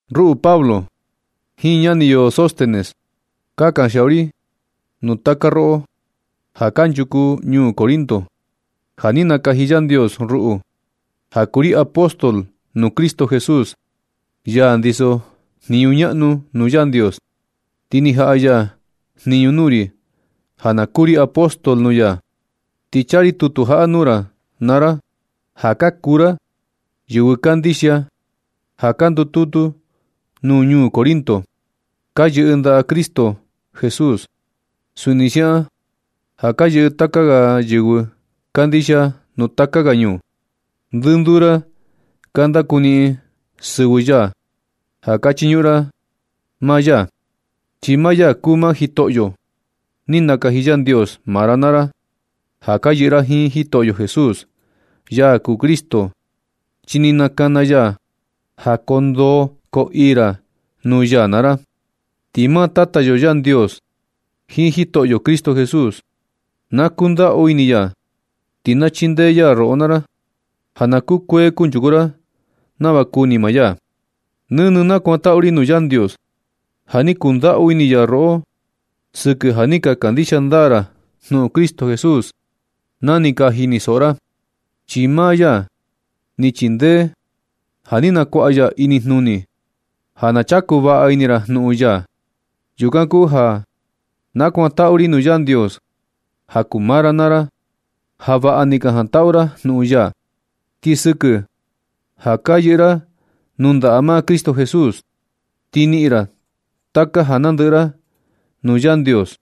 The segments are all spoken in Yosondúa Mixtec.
Ruꞌu Pablo jiin ñani yo Sóstenes, ka kanxiaꞌu ri nuu taka roꞌo ja kanchuku ñuu Corinto. Ja ni nakaji Yandios ruꞌu ja kuu ri apóstol nuu Cristo Jesús, ya ndiso jniñu ñaꞌnu nuu Yandios, ti ni jaꞌa ya jniñu nuu ri ja na kuu ri apóstol nuu ya. Ti chaa ri tutu jaꞌa nuu ra naa ra ja ka kuu ra yɨvɨ kandixia, ja ka ndututu nuu ñuu Corinto. Ka yɨꞌɨ ndaꞌa Cristo Jesús suni siaꞌan ja ka yɨꞌɨ taka ga yɨvɨ kandixia nuu taka ga ñuu. Ndɨnduu ra ka ndakuniꞌin ra sɨvɨ ya ja ka chiñuꞌun ra maa ya, chi maa ya kuu maa Jitoꞌyo. Ni nakaji Yandios maa ra naa ra ja ka yɨꞌɨ ra jiin Jitoꞌyo Jesús, ya kuu Cristo, chi ni nakana ya ja koo ndoo koo ii ra nuu ya naa ra. Ti maa Tata yo Yandios jiin Jitoꞌyo Cristo Jesús, na kundaꞌu ini ya ti na chindee ya roꞌo naa ra, ja na kukuee kunchuku ra nava kuni maa ya. Nɨnɨ nakuantaꞌu ri nuu Yandios ja ni kundaꞌu ini ya roꞌo sɨkɨ ja ni ka kandixia ndaa ra jnuꞌun Cristo Jesús na ni ka jinisoꞌo ra, chi maa ya ni chindee ja ni nakuaꞌa ya inijnuni ja na chaku vaꞌa ini ra jnuꞌun ya. Yukan kuu ja nakuantaꞌu ri nuu Yandios ja kuu maa ra naa ra ja vaꞌa ni ka jantaꞌu ra jnuꞌun ya. Ti sɨkɨ ja ka yɨꞌɨ ra nuu ndaꞌa maa Cristo Jesús, ti niꞌin ra taka ja nandɨꞌɨ ra nuu Yandios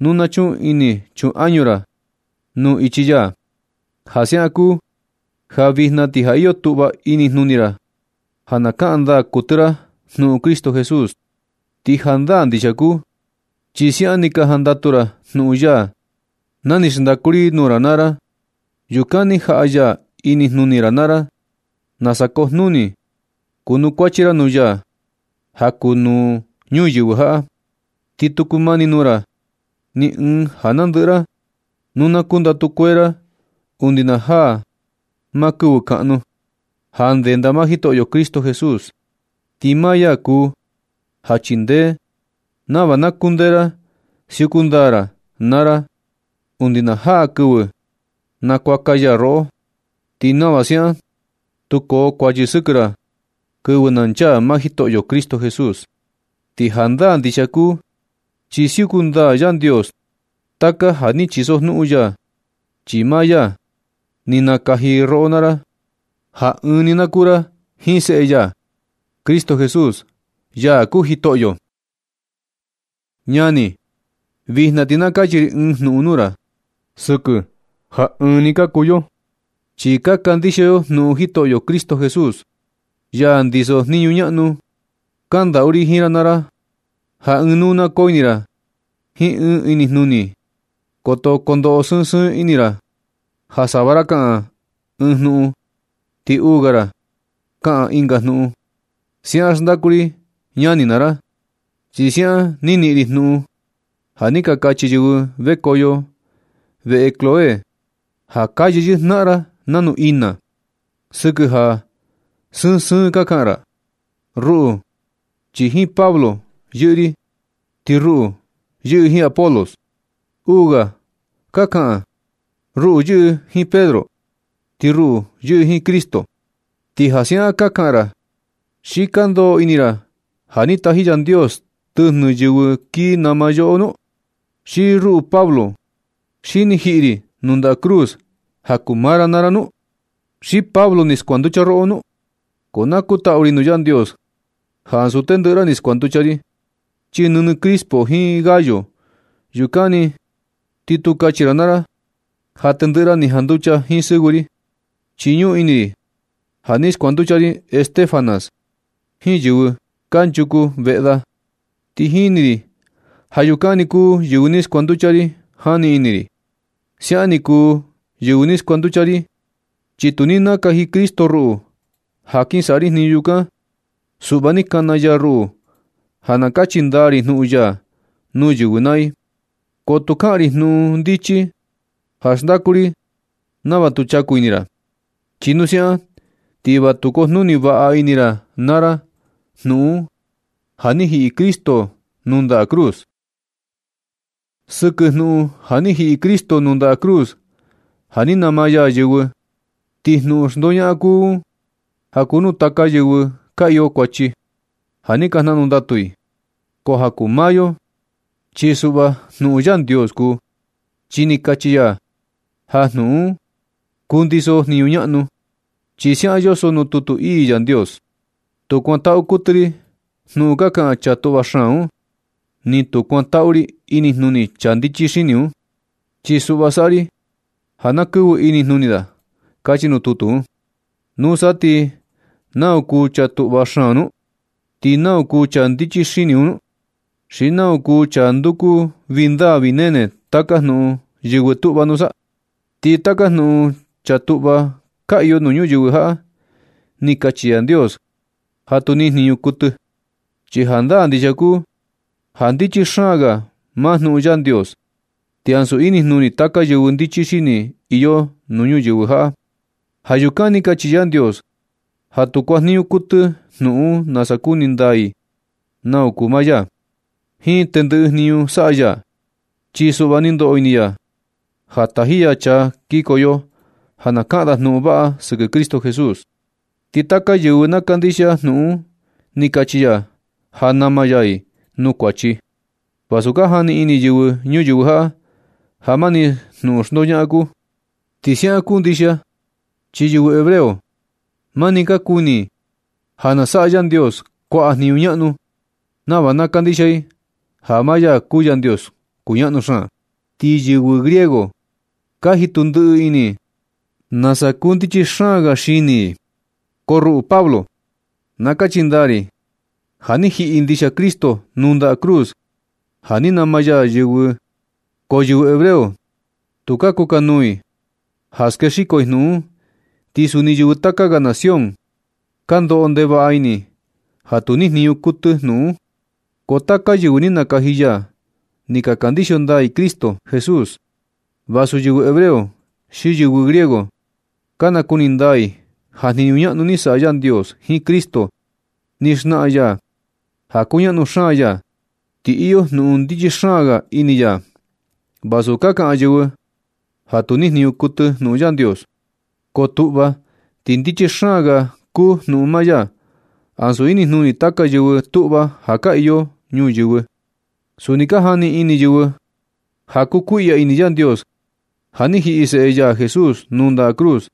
nu na chuꞌun ini chuꞌun añu ra nuu ichi ya. Ja siaꞌan kuu ja vijna ti ja ka iyo tuꞌva inijnuni ra ja na kaꞌan ndaa kuɨtɨ ra jnuꞌun Cristo Jesús. Ti jandaa ndixia kuu, chi siaꞌan ni ka jantaꞌu ra jnuꞌun ya na ni xndaku ri nuu ra naa ra. Yukan ni jaꞌa ya inijnuni ra naa ra nasa kojnuni kuanukuachi ra nuu ya ja kuu nuu ñuyɨvɨ jaꞌa. Ti tu kumani nuu ra ni ɨɨn ja nandɨꞌɨ nu na kundatu kuee ra undi na jaa maa kɨvɨ kaꞌnu, ja ndenda maa Jitoꞌyo Cristo Jesús. Ti maa ya kuu ja chindee nava na kundee ra siuku ndaa ra naa ra undi na jaa kɨvɨ nakuaka ya roꞌo, ti nava siaꞌan tu koo kuachi sɨkɨ ra kɨvɨ na nchaa maa Jitoꞌyo Cristo Jesús. Ti jandaa ndixia kuu chi siuku ndaa Yandios taka ja ni chisojnuꞌun ya, chi maa ya ni nakaji roꞌo naa ra ja ɨɨn ni na kuu ra jiin seꞌe ya Cristo Jesús, ya kuu Jitoꞌyo. Ñani, vijna ti na kachi ri ɨɨn jnuꞌun nuu ra, sɨkɨ ja ɨɨn ni ka kuu yo, chi ka kandixia yo jnuꞌun Jitoꞌyo Cristo Jesús, ya ndiso jniñu ñaꞌnu. Kandaꞌu ri jiin ra naa ra ja ɨɨn nuu na koo ini ra jiin ɨɨn ni inijnuni. Koto kondoꞌo sɨɨn sɨɨn ini ra, ja sava ra kaꞌan ɨɨn jnuꞌun ti uu ga ra kaꞌan ɨnga jnuꞌun. Siaꞌan xndaku ri, ñani naa ra, chi siaꞌan ni niꞌin ri jnuꞌun ja ni ka kachi yɨvɨ vekoꞌo veꞌe Cloé, ja ka yeyɨꞌɨ jnaꞌan ra nanu ina sɨkɨ ja sɨɨn sɨɨn ka kaꞌan ra: “Ruꞌu chi jiin Pablo yɨꞌɨ ri.” “Ti ruꞌu yɨꞌɨ jiin Apolos.” Uu ga ka kaꞌan: “Ruꞌu yɨꞌɨ jiin Pedro.” “Ti ruꞌu yɨꞌɨ jiin Cristo.” Ti ja siaꞌan ka kaꞌan ra ¿xi ka ndoꞌo ini ra ja ni taji Yandios tɨjnɨ yɨvɨ kii nama yoꞌo nu? ¿Xi ruꞌu Pablo, xi ni jiꞌi ri nuu ndaꞌa cruz ja kuu maa ra naa ra nu? ¿Xi Pablo, ni skuanducha roꞌo nu? Ko na kutaꞌu ri nuu Yandios ja ansu tendɨꞌɨ ra ni skuanducha ri, chi nɨnɨ Crispo jiin Gayo, yukan ni. Ti tu kachi ra naa ra ja tendɨꞌɨ ra ni ka janducha jiin sɨvɨ ri. Chi ñuꞌun ini ri ja ni skuanducha ri Estéfanas jiin yɨvɨ kanchuku veꞌe da. Ti jini ri ja yukan ni kuu yɨvɨ ni skuanducha ri jani ini ri. Siaꞌan ni kuu yɨvɨ ni skuanducha ri, chi tu ni nakaji Cristo ruꞌu ja kin saꞌa ri jniñu yukan. Suꞌva ni kana ya ruꞌu ja na kachi ndaa ri jnuꞌun ya nuu yɨvɨ naa i. Ko tu kaꞌan ri jnuꞌun ndichi ja xndaku ri nava tu chaku ini ra. Chi nu siaꞌan ti va tu kujnuni vaꞌa ini ra na ra jnuꞌun un ja ni jiꞌi Cristo nuu ndaꞌa cruz. Sɨkɨ jnuꞌun ja ni jiꞌi Cristo nuu ndaꞌa cruz ja ni nama ya yɨvɨ, ti jnuꞌun xndoñaꞌan kuu un ja kuu nuu taka yɨvɨ ka iyo kuachi, ja ni ka jnaꞌnu ndatu i. Ko ja kuu maa yo, chi suꞌva jnuꞌun Yandios kuu, chi ni kachi ya ja jnuꞌun un kundiso jniñu ñaꞌnu. Chi siaꞌan yoso nuu tutu ii Yandios: Tu kuantaꞌu kuɨtɨ ri jnuꞌun ka kaꞌan chaa tuꞌva xaan un. Ni tu kuantaꞌu ri inijnuni chaa ndichi xini un. Chi suꞌva saꞌa ri ja na kɨꞌvɨ inijnuni da. Kachi nuu tutu un. ¿Nusa ti nau kuu chaa tuꞌva xaan nu? ¿Ti nau kuu chaa ndichi xini un nu? ¿Xi nau kuu chaa nanduku vii ndaa vii nene taka jnuꞌun yɨvɨ tuꞌva nusa? Ti taka jnuꞌun chaa tuꞌva ka iyo nuu ñuyɨvɨ jaꞌa, ni kachi Yandios ja tu niꞌin jniñu kuɨtɨ. Chi jandaa ndixia kuu ja ndichi xaan ga maa jnuꞌun Yandios, ti ansu inijnuni taka yɨvɨ ndichi xini iyo nuu ñuyɨvɨ jaꞌa. Ja yukan ni kachi Yandios ja tu kuajniñu kuɨtɨ jnuꞌun un nasa nakuni ndaa i nau kuu maa ya jiin tendɨꞌɨ jniñu saꞌa ya. Chi suꞌva ni ndoꞌo ini ya ja taji ya chaa kikoyo ja na kaꞌan da jnuꞌun vaꞌa sɨkɨ Cristo Jesús. Ti taka yɨvɨ na kandixia jnuꞌun un ni kachi ya ja nama ya i nuu kuachi, vasu ka jani ini yɨvɨ ñuyɨvɨ jaꞌa ja mani jnuꞌun xndoñaꞌan kuu. Ti siaꞌan kundixia chi yɨvɨ hebreo, mani ka kuni i ja na saꞌa Yandios kuaꞌa jniñu ñaꞌnu nava na kandixia i ja maa ya kuu Yandios kuñaꞌnu xaan. Ti yɨvɨ griego ka jitu ndiꞌi ini i nasa kundichi xaan ga xini i. Ko ruꞌu Pablo, na kachi ndaa ri ja ni jiꞌi ndixia Cristo nuu ndaꞌa cruz ja ni nama ya yɨvɨ. Ko yɨvɨ hebreo tu kukanuu i ja skexiko jnuꞌun un. Ti suni yɨvɨ taka ga nación ka ndoꞌo ndevaꞌa ini i ja tu nijniñu kuɨtɨ jnuꞌun un. Ko taka yɨvɨ ni nakaji ya ni ka kandixia ndaa i Cristo Jesús, vasu yɨvɨ hebreo xi yɨvɨ griego, ka nakuni ndaa i ja jniñu ñaꞌnu ni saꞌa Yandios jiin Cristo. Ni xnaꞌan ya ja kuñaꞌnu xaan ya, ti iyo jnuꞌun ndichi xaan ga ini ya. Vasu ka kaꞌan yɨvɨ ja tu ni jniñu kuɨtɨ jnuꞌun Yandios, ko tuꞌva ti ndichi xaan ga kuu jnuꞌun maa ya, ansu inijnuni taka yɨvɨ tuꞌva ja ka iyo nuu ñuyɨvɨ. Suni ka jani ini yɨvɨ ja kukuiꞌya ini Yandios ja ni jiꞌi seꞌe ya Jesús nuu ndaꞌa cruz.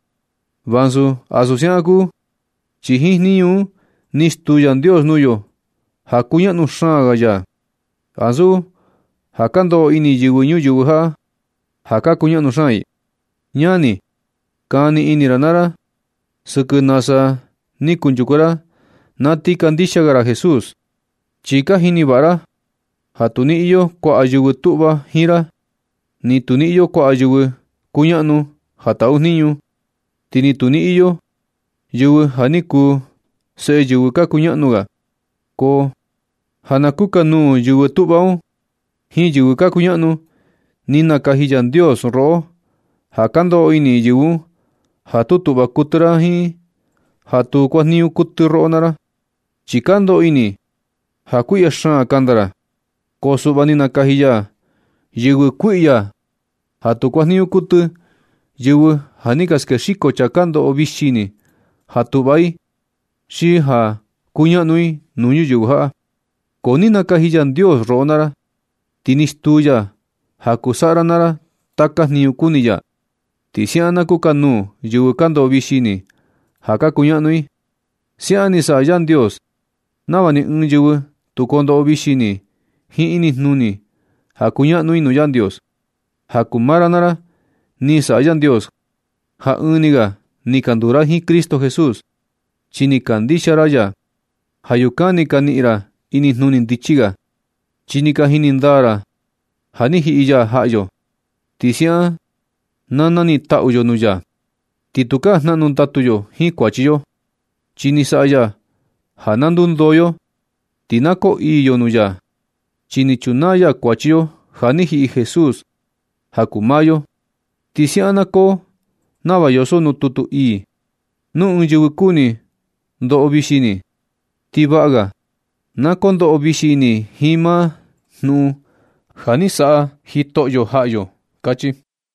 Vasu ansu siaꞌan kuu, chi jiin jniñu un ni stuu Yandios nuu yo ja kuñaꞌnu xaan ya, ansu ja ka ndoꞌo ini yɨvɨ ñuyɨvɨ jaꞌa ja ka kuñaꞌnu xaan i. Ñani, kani ini naa ra sɨkɨ nasa ni kunchuku ra na ti kandixia ga ra Jesús, chi ka jini vaꞌa ra ja tu ni iyo kuaꞌa yɨvɨ tuꞌva jiin ra, ni tu ni iyo kuaꞌa yɨvɨ kuñaꞌnu ja taꞌu jniñu, ti ni tu ni iyo yɨvɨ ja ni kuu seꞌe yɨvɨ ka kuñaꞌnu ga. Ko ja na kukanuu yɨvɨ tuꞌva un jiin yɨvɨ ka kuñaꞌnu, ni nakaji Yandios roꞌo ja ka ndoꞌo ini yɨvɨ un ja tu tuꞌva kuɨtɨ ra jiin ja tu kuajniñu kuɨtɨ roꞌo naa ra, chi ka ndoꞌo ini i ja kuiꞌya xaan kanda ra. Ko suꞌva ni nakaji ya yɨvɨ kuiꞌya ja tu kuanjniñu kuɨtɨ, yɨvɨ ja ni ka skexiko chaa ka ndoꞌo vixi ini ja tuꞌva i xi ja kuñaꞌnu i nuu ñuyɨvɨ jaꞌa. Ko ni nakaji Yandios roꞌo naa ra, ti ni stuu ya ja kuu saꞌa ra naa ra taka jniñu kuni ya, ti siaꞌan na kukanuu yɨvɨ ka ndoꞌo vixi ini ja ka kuñaꞌnu i. Siaꞌan ni saꞌa Yandios nava ni ɨɨn yɨvɨ tu kondoꞌo vixi ini jiin inijnuni ja kuñaꞌnu i nuu Yandios. Ja kuu maa ra naa ra ni saꞌa Yandios ja ɨɨn ni ga ni ka nduu ra jiin Cristo Jesús, chi ni ka kandixia ra ya. Ja yukan ni ka niꞌin ra inijnuni ndichi ga, chi ni ka jini ndaa ra ja ni jiꞌi ya jaꞌa yo. Ti siaꞌan na na niꞌin taꞌu yo nuu ya, ti tukaa jnaꞌnu ndatu yo jiin kuachi yo, chi ni saꞌa ya ja na ndundoo yo, ti na koo ii yo nuu ya. Chi ni chunaa ya kuachi yo ja ni jiꞌi Jesús ja kuu maa yo. Ti siaꞌan na koo nava yoso nuu tutu ii: “Nu ɨɨn yɨvɨ kuni ndoꞌo vixi ini, ti vaꞌa ga na kondoꞌo vixi ini i jiin maa jnuꞌun ja ni saꞌa Jitoꞌyo jaꞌa yo”, kachi.